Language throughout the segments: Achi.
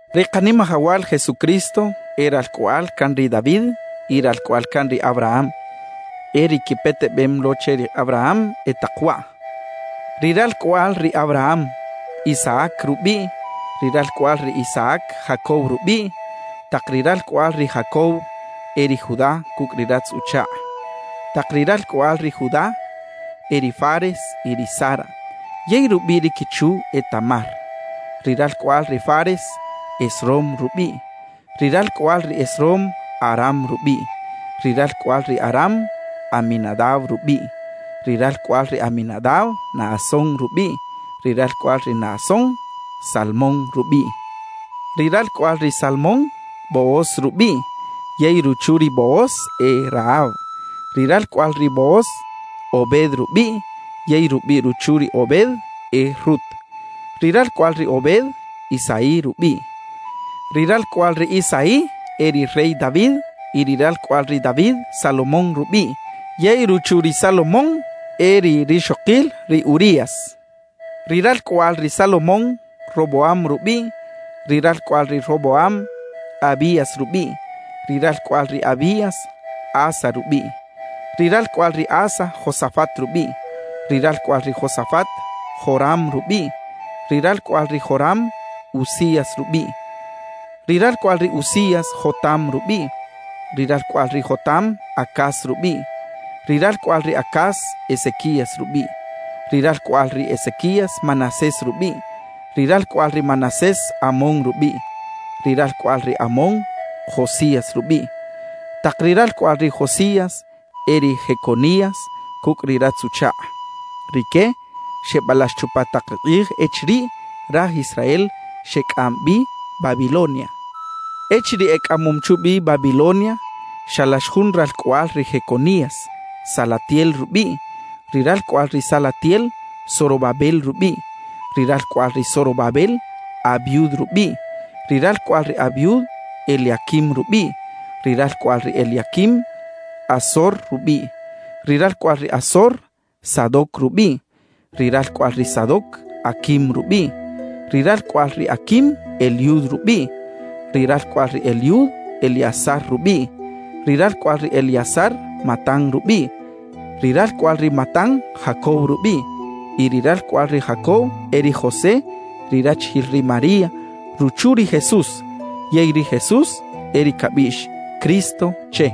Ri Kanimajawal Jesucristo e ralcꞌoꞌal can ri David y ralcꞌoꞌal can ri Abraham. E ri quipetebem lo che ri Abraham e tak waꞌ: Ri ralcꞌoꞌal ri Abraham, Isaac rubiꞌ; ri ralcꞌoꞌal ri Isaac, Jacob rubiꞌ; tak ri ralcꞌoꞌal ri Jacob, e ri Judá cucꞌ ri ratz-uchakꞌ. Tak ri ralcꞌoꞌal ri Judá, e ri Fares y ri Zara yey rubiꞌ ri quichu e Tamar; ri ralcꞌoꞌal ri Fares, Esrom rubiꞌ; ri ralcꞌoꞌal ri Esrom, Aram rubiꞌ. Ri ralcꞌoꞌal ri Aram, Aminadab rubiꞌ; ri ralcꞌoꞌal ri Aminadab, Naasón rubiꞌ; ri ralcꞌoꞌal ri Naasón, Salmón rubiꞌ. Ri ralcꞌoꞌal ri Salmón, Booz rubiꞌ yey ruchu ri Booz e Rahab. Ri ralcꞌoꞌal ri Booz, Obed rubiꞌ yey rubiꞌ ruchu ri Obed e Rut. Ri ralcꞌoꞌal ri Obed, Isaí rubiꞌ. Ri ralcꞌoꞌal ri Isaí, e ri rey David y ri ralcꞌoꞌal ri David, Salomón rubiꞌ yey ruchu ri Salomón e ri rixokil ri Urías. Ri ralcꞌoꞌal ri Salomón, Roboam rubiꞌ; ri ralcꞌoꞌal ri Roboam, Abías rubiꞌ; ri ralcꞌoꞌal ri Abías, Asa rubiꞌ. Ri ralcꞌoꞌal ri Asa, Josafat rubiꞌ; ri ralcꞌoꞌal ri Josafat, Joram rubiꞌ; ri ralcꞌoꞌal ri Joram, Uzías rubiꞌ. Ri ralcꞌoꞌal ri Uzías, Jotam rubiꞌ; ri ralcꞌoꞌal ri Jotam, Acaz rubiꞌ; ri ralcꞌoꞌal ri Acaz, Ezequías rubiꞌ. Ri ralcꞌoꞌal ri Ezequías, Manasés rubiꞌ; ri ralcꞌoꞌal ri Manasés, Amón rubiꞌ; ri ralcꞌoꞌal ri Amón, Josías rubiꞌ. Tak ri ralcꞌoꞌal ri Josías, e ri Jeconías cucꞌ ri ratz-uchakꞌ; rique xebalax chupa tak ri kꞌij echiriꞌ raj Israel xecꞌam bi Babilonia. Echiriꞌ ecꞌamom chubi Babilonia, xalax jun ralcꞌoꞌal ri Jeconías, Salatiel rubiꞌ; ri ralcꞌoꞌal ri Salatiel, Zorobabel rubiꞌ. Ri ralcꞌoꞌal ri Zorobabel, Abiud rubiꞌ; ri ralcꞌoꞌal ri Abiud, Eliaquim rubiꞌ; ri ralcꞌoꞌal ri Eliaquim, Azor rubiꞌ. Ri ralcꞌoꞌal ri Azor, Sadoc rubiꞌ; ri ralcꞌoꞌal ri Sadoc, Aquim rubiꞌ; ri ralcꞌoꞌal ri Aquim, Eliud rubiꞌ. Ri ralcꞌoꞌal ri Eliud, Eleazar rubiꞌ; ri ralcꞌoꞌal ri Eleazar, Matán rubiꞌ; ri ralcꞌoꞌal ri Matán, Jacob rubiꞌ. Y ri ralcꞌoꞌal ri Jacob e ri José, ri rachijil ri María, ruchu ri Jesús. Yey ri Jesús e ri cabiꞌx “Cristo” che.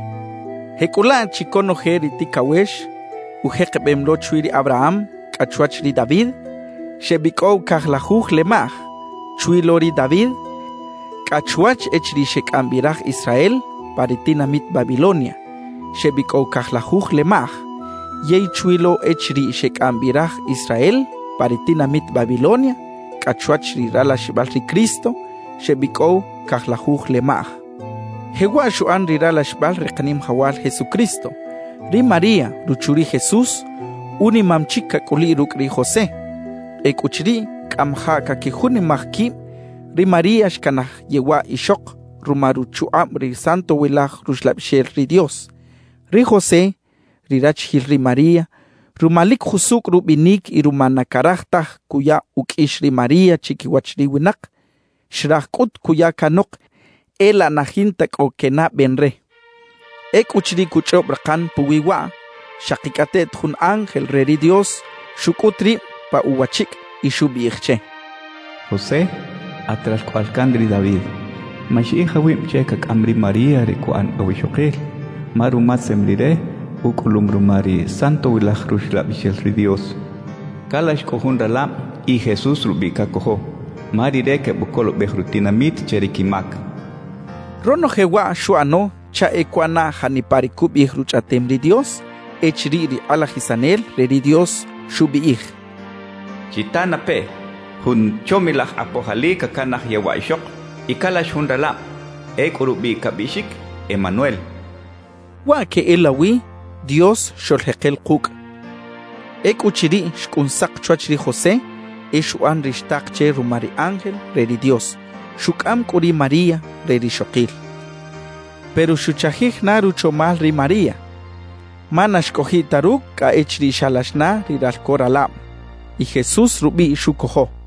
Jecꞌulaꞌ chi conoje ri ticawex ujekebem lo chwi ri Abraham cꞌa chwach ri David, xebicꞌow cajlajuj lemaꞌj; chwi lo ri David cꞌa chwach echiriꞌ xecꞌam bi raj Israel pa ri tinamit Babilonia, xebicꞌow cajlajuj lemaꞌj; yey chwi lo echiriꞌ xecꞌam bi raj Israel pa ri tinamit Babilonia cꞌa chwach ri ralaxibal ri Cristo, xebicꞌow cajlajuj lemaꞌj. Jewaꞌ xuꞌan ri ralaxibal ri Kanimajawal Jesucristo: Ri María, ruchu ri Jesús, unimam chic cacꞌuliꞌ rucꞌ ri José. Ecꞌuchiriꞌ cꞌamajaꞌ caquijunimaj quib, ri María xcanaj yewaꞌ ixok ruma ruchukꞌab ri Santowilaj Ruxlabixel ri Dios. Ri José, ri rachijil ri María, ruma lic jusucꞌ rubinic y ruma na caraj taj cuya uqꞌuix ri María chiquiwach ri winak, xraj cꞌut cuya canok e laꞌ na jinta cꞌo quenaꞌben re. Ecꞌuchiriꞌ cuchꞌob rakan puwi waꞌ, xakicꞌateꞌt jun ángel re ri Dios xucꞌut rib pa uwachicꞌ y xubiꞌij che: «José, at ralcꞌoꞌal can ri David, maxiꞌij awib che cacꞌam ri María re cuꞌan awixokil, ma rumatzem rire, ucꞌulum ruma ri Santowilaj Ruxlabixel ri Dios. Calax cꞌu jun ralab y Jesús rubiꞌ cacojo, ma Rire quebucolobej rutinamit che ri quimac» xchaꞌ. Ronoje waꞌ xuꞌano chaꞌ e cuꞌana janipa ri cubiꞌij Ruchꞌaꞌtem ri Dios echiriꞌ ri kꞌalajisanel re ri Dios xubiꞌij: Chitanapeꞌ: Jun chomilaj kꞌapoj ali cacanaj yewaꞌ ixok y calax jun ralab. Ecꞌu rubiꞌ cabiꞌxic: Emanuel xchaꞌ. Waꞌ queꞌelawi “Dios xoꞌljekel kucꞌ”. Ecꞌuchiriꞌ xcꞌun sak chwach ri José, e xuꞌan ri xtak che ruma ri ángel re ri Dios; xucꞌam cꞌu ri María re rixokil. Pero xuchajij na ruchomal ri María ma na xcꞌojiꞌ ta rucꞌ cꞌa echiriꞌ xalax na ri ralco ralab. Y Jesús rubiꞌ xucojo.